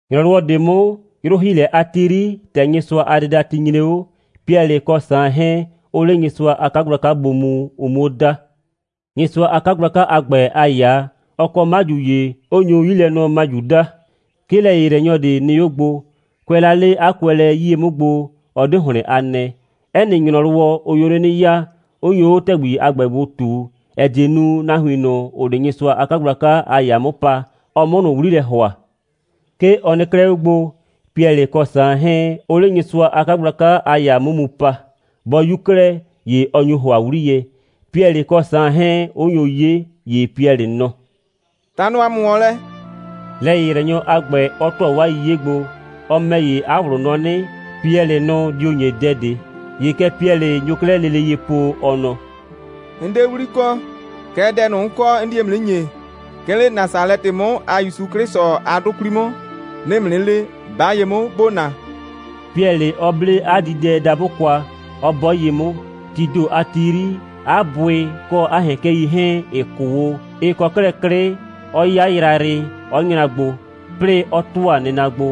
‑Nyrɔwɔ ꞊de 'mʋ, 'yrʋ‑hiilɛ a ti 'yri, ‑tɛ Nyɩsʋa a dɩdati nyre 'o, Piɛlɩ kɔ Saan 'hɛɛn, 'ʋʋ 'le Nyɩsʋa a 'kagblaka gbo mu, ʋ 'muo da. Nyɩsʋa a 'kagblaka a ‑gbɛ a ‑yaa, ɔ kɔ 'maju ‑ye, 'ʋ nyu 'Yilɛnɔmaju daa. 'Ke lɛ‑yɩyrɛnyɔ ꞊de nɩ 'o gbo. Kʋɛ la 'le 'a kʋɛlɛ 'yie 'mʋ gbo, ɔ 'de ‑hlɩn a nɛɛ. 'Ɛ nɩ ‑nyrɔwɔ, ʋ nyo 'le 'nɩ ya, 'ʋ nyo 'o ‑tɛgbi a ‑gbɛ gbo ꞊tu, ‑ɛ die nu, nahuin ꞊nʋ, ‑ʋʋ 'le Nyɩsʋa a 'kagblaka a ‑yaa 'mʋ pa, ɔ 'mʋ ꞊nʋ 'wli lɛ ‑hʋa. 'Ke ɔ nɩ 'klɛɛ 'o gbo, Piɛlɩ kɔ Saan 'hɛɛn, 'ʋʋ 'le Nyɩsʋa a 'kagblaka a ‑yaa 'mʋ mu pa. Bɔ 'yu 'klɛɛ, ‑ye ɔ nyu ‑hʋa 'wliyɛ, Piɛlɩ kɔ Saan 'hɛɛn, 'ʋ nyo 'ye, ‑ye Piɛlɩ nɔ: «Ta nɔ ‑a mʋ ‑wɔn lɛ!» lɛ‑yɩyrɛnyɔ a ‑gbɛ 'ɔ ‑tʋa 'waa 'yiye gbo. Ɔ ‑mɛ ‑ye, 'a ꞊wlʋ nɔ 'nɩ, Piɛlɩ nʋ dio ‑nye dɛ ꞊de. ‑Ye kɛ Piɛlɩ nyo 'klɛɛ lele ye po, ɔ nɔ: «'N 'de 'wli kɔ. Kɛɛ, dɛ 'n kɔ, 'n die ‑mʋ 'nɩ ‑nye: 'Ke 'le Nasalɛtɩ 'mʋ a ‑Yusu 'Klɩsʋ a 'dʋ 'kwli 'mʋ, 'nɩɩ ‑mʋ 'nɩ le, 'ba ye 'mʋ, ‑bo na!» Piɛlɩ 'ɔ 'ble 'a diidɛdabʋ kwa, 'ɔ 'bɔ ye 'mʋ. Tii ‑do a ti 'yri, 'a bʋɩ kɔ 'a ‑hɛkɛi 'hɛɛn, ‑ɩ 'kʋ o, ɩ kɔ 'klɛɛ 'klɩ, 'ɔ 'ya yrayrɩ, 'ɔ nyra gbo, 'plɩɩ 'ɔ ‑tʋa nɩna gbo,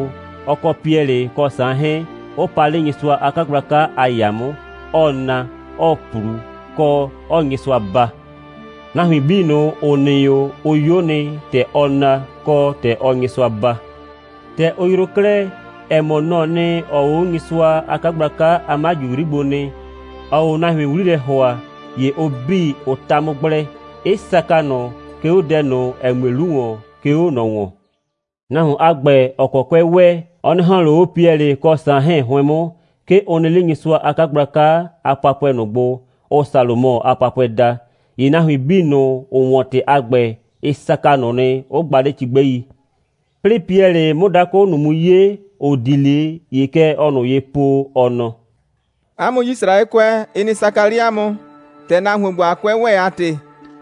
ɔ kɔ Piɛlɩ kɔ Saan 'hɛɛn, 'ʋ pa 'le Nyɩsʋa a 'kagblaka a ‑yaa 'mʋ, 'ɔɔ na, 'ɔɔ ꞊plu, kɔ, 'ɔɔ Nyɩsʋa baa. Nahuin 'bii ꞊nʋ, ‑ʋ nɩ 'o, ʋ 'yo nɩ, ‑tɛ ɔɔ na, kɔ, ‑tɛ ɔɔ Nyɩsʋa baa. ‑Tɛ ʋ yroo 'klɛɛ, ‑ɛ mɔ, nɔ‑ɔ nɩ, ‑ɔɔ o 'o Nyɩsʋa a 'kagblaka a 'maju 'yri gbo nɩ, ‑ɔɔ nahuin 'wli lɛ ‑hʋa, ‑ye ʋ 'bii, ʋ ta 'mʋ gblɛ, 'ɩ saka ꞊nʋ, 'ke 'o dɛ ꞊nʋ, ‑ɛ mue 'lu ‑wɔn, 'ke 'o ꞊nɔ ‑wɔn. Nahuon a ‑gbɛ, ‑ɔ kɔ 'kʋɛ ‑wɛ, ɔ 'nɩ ‑hɔn ꞊le 'o Piɛlɩ kɔ Saan 'hɛɛn 'hʋɩn 'mʋ. 'Ke ʋ nɩ 'le Nyɩsʋa a 'kagblaka a papʋɛ ꞊nʋ gbo, ʋʋ Salomɔ a papʋɛ daa. ‑Ye nahuin 'bii ꞊nʋ, ‑ʋ 'wɔn ‑tɩ a ‑gbɛ, ɩ saka ꞊nʋ nɩ, 'ʋ gba 'le cigbɛi. 'Plɩɩ Piɛlɩ 'mʋ dakʋ ꞊nʋ mu 'ye, ‑ʋ di 'le, ‑ye kɛ ɔɔ ꞊nʋ ye po, ɔ nɔ: «'A mʋ Yisraɛkʋɛ, ɩ nɩ saka 'le 'a mʋ, ‑tɛ nahuon ‑gbo a 'kʋɛ ‑wɛ a ‑tɩ.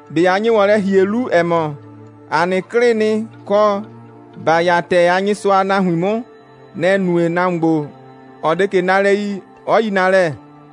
꞊Be a nye ‑wɔn lɛ ‑hie 'lu, ‑ɛ mɔ, ‑a nɩ 'klɩɩ nɩ, kɔ, ‑ba 'ya ‑tɛɛ a Nyɩsʋa a nahuin 'mʋ, nɛ‑ nue, nahuon ‑gbo, ‑ɔ 'de ꞊ke nalɛ yi, 'ɔ yi nalɛ?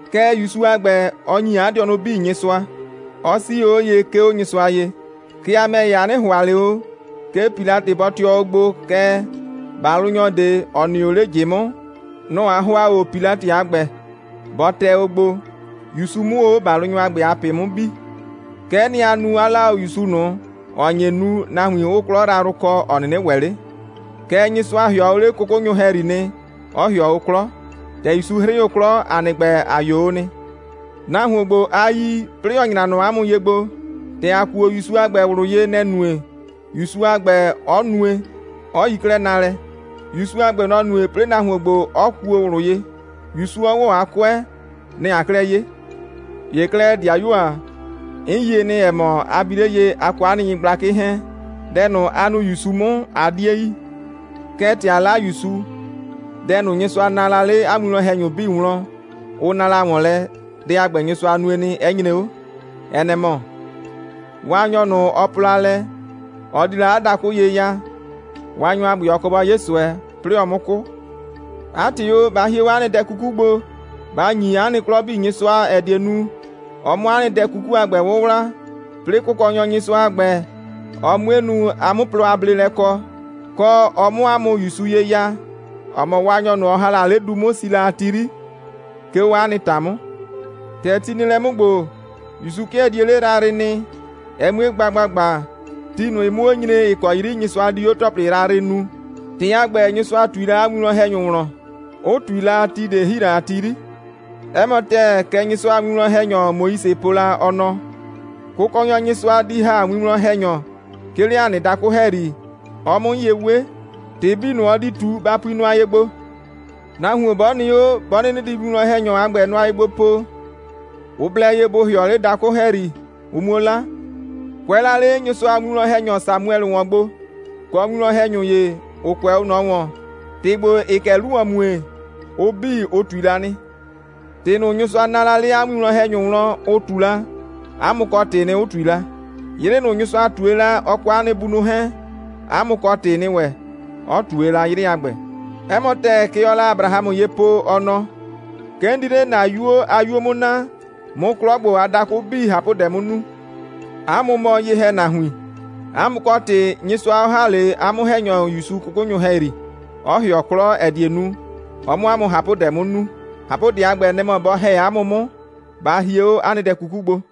Kɛɛ, ‑Yusu a ‑gbɛ, ɔ ‑nyi 'a dɩɔnʋ 'bii Nyɩsʋa, 'ɔ 'sii 'o ye, 'ke 'o Nyɩsʋa ye. Kɛɛ, a ‑mɛ ‑ye, a 'nɩ ‑hʋa ꞊le o, 'ke Pilatɩ bɔ tɩɔ o gbo, kɛɛ, ‑balʋnyɔ ꞊de, ‑ɔ nɩ o 'le ꞊jɩ 'mʋ, nɔ‑ a ‑hʋa o Pilatɩ a ‑gbɛ, bɔ tɛ o gbo, ‑Yusu 'mʋ o 'o ‑balʋnyɔ a ‑gbɛ a ꞊pɩ 'mʋ bi. Kɛ'ɛ nɩ, a nu, 'a 'la o ‑Yusu ꞊nʋ, ‑ɔ nye nu, nahuin 'ʋʋ 'klɔ yrayrʋ kɔ, ‑ɔ 'nɩnɩ ‑wɛ 'le. Kɛɛ, Nyɩsʋa ‑hɩɔ o 'le 'kʋkʋnyʋ ‑hɛyri nɩ, 'ɔ ‑hɩɔ o 'klɔ. ‑Tɛ ‑Yusu 'hrɩ o 'klɔ, ‑a nɩ ‑gbɛ, ‑a 'yo o nɩ. Nahuon ‑gbo, a yi, 'plɩɩ ‑ɔ nyra nɔ 'a mʋ ye gbo, ‑tɛ ‑a kuo ‑Yusu a ‑gbɛ ꞊wlʋ ye, nɛ‑ nue, ‑Yusu a ‑gbɛ 'ɔ nue, 'ɔ yi 'klɛɛ nalɛ. ‑Yusu a ‑gbɛ, nɔ‑ nue, 'plɩɩ nahuon ‑gbo, 'ɔ kuo ꞊wlʋ ye, ‑Yusu 'ɔ ‑wɔ 'a 'kʋɛ. Nɛ‑ aa 'klɛɛ 'ye. ‑Ye 'klɛɛ, ‑dɩayuo ‑a, 'n yie nɩ, ‑ɛ mɔ, a bi 'le ye, a kɔ 'a nɩ nyɩgblakɩ 'hɛɛn, dɛ ꞊nʋ, a nu ‑Yusu 'mʋ, a 'die yi. Kɛɛ, ‑tɛ a 'la ‑Yusu, dɛ ꞊nʋ, Nyɩsʋa naa la 'le 'a winwlɔn‑hɛnyʋ 'bii wlɔn, ʋ na la ‑wɔn lɛ, dɛ a ‑gbɛ, Nyɩsʋa nue nɩ, 'ɛ nyre 'o. Ɛ nɛ‑ mɔ: Waanyɔ ꞊nʋ, ɔ po la lɛ, ɔ di la 'a dakʋ ye ya, Waanyɔ a ‑gbɛ, ɔ kɔ bɔ 'ye ꞊sʋɛ, 'plɩɩ ɔ 'mʋ 'kʋ. 'A ‑tɩ o, ba hie 'o 'a nɩ dɛ 'kuku gbo, ba ‑nyi 'a nɩ 'klɔ 'bii Nyɩsʋa, ‑ɛ die nu, ɔ 'mʋ 'a nɩ dɛ 'kuku a ‑gbɛ 'wʋwla, 'plɩɩ Kʋkɔnyɔ Nyɩsʋa a ‑gbɛ, ɔ 'mue nu, a 'mʋ plɔ a bleelɛ kɔ, kɔ, ɔ 'mʋ 'a mʋ ‑Yusu ye ya, ‑ɔ mɔ Waanyʋ ꞊nʋ, ɔ ‑ha la 'le du 'mʋ, si la a ti 'yri, 'ke 'o 'a nɩ ‑ta 'mʋ. ‑Tɛ ti nɩ lɛ 'mʋ ‑gbo, ‑Yusu 'kɩɛ die 'le yrayrɩ nɩ, ɛ 'mue gba ‑gbagba, ti ꞊nʋ 'mʋ 'o nyre, ‑ɩ kɔ 'yri Nyɩsʋa di 'o ‑tɔplɩ yrayrɩ nuu. ‑Tɩ a ‑gbɛ, Nyɩsʋa ꞊tui la 'a winwlɔn‑hɛnyʋ wlɔn, 'ʋ ꞊tui la, ti ꞊de ‑hi la a ti 'yri. 'Ɛ mɔ ‑tɛɛ, kɛ Nyɩsʋa a winwlɔn‑hɛnyɔ Moise po la, ɔ nɔ: Kʋkɔnyɔ Nyɩsʋa di ‑ha winwlɔn‑hɛnyɔ, 'ke 'le ‑a nɩ dakʋ ‑hɛyri, ɔ 'mʋ 'mʋ ye 'we. ‑Tɩ 'bii ꞊nʋ, ɔ di ꞊tu, ba pui nʋa ye gbo. Nahuon 'bɔ nɩ 'o, 'bɔ 'nɩnɩ di winwlɔn‑hɛnyɔ a ‑gbɛ nʋa ye gbo po, ʋ blɛ ye bʋ ‑hɩɔ 'le dakʋ ‑hɛyri, ʋ 'muo 'la. Kʋɛ la 'le Nyɩsʋa a winwlɔn‑hɛnyɔ Samuɛlɩ ‑wɔn gbo, kɔ winwlɔn‑hɛnyʋ ‑ye, ‑ʋ kʋɛ 'o ꞊nɔ ‑wɔn, ‑tɩ ‑gbo, ‑ɩɩ kɛ 'lu ‑wɔn mue, ʋ 'bii, ʋ ꞊tui la nɩ. ‑Tɩ ꞊nʋ, Nyɩsʋa naa la 'le 'a winwlɔn‑hɛnyʋ wlɔn, ʋ ꞊tu la, 'a mʋ kɔ ‑tɩɩ nɩ, 'ʋ ꞊tui la. 'Yrɩ ꞊nʋ, Nyɩsʋa ꞊tue la, ɔ kɔ 'a nɩ bunʋ 'hɛɛn, 'a mʋ kɔ ‑tɩɩ nɩ ‑wɛ, 'ɔ ꞊tue la 'yrɩ a ‑gbɛ. 'Ɛ mɔ ‑tɛɛ, kɛ ɔɔ la Abrahamʋ ye po, ɔ nɔ: 'Ke 'n di 'le ‑na 'yuo a 'yuo 'mʋ naa, 'mʋ 'klɔ ‑gbo a dakʋ 'bii ꞊hapʋdɛ 'mʋ nu. 'A mʋ mɔ ye‑hɛnahuin, 'a mʋ kɔ ‑tɩ Nyɩsʋa 'ɔ ‑ha 'le 'a 'mʋ‑hɛnyɔ ‑Yusu 'kʋkʋnyʋ ‑hɛyri, 'ɔ ‑hɩɔ 'klɔ, ‑ɛ die nu, ɔ 'mʋ 'a mʋ ꞊hapʋdɛ 'mʋ nu. ꞊Hapʋdɛ a ‑gbɛ, nɛ‑ mɔ, bɔ ‑hɛ 'a mʋ 'mʋ, ba hie 'o 'a nɩ dɛ 'kuku gbo.»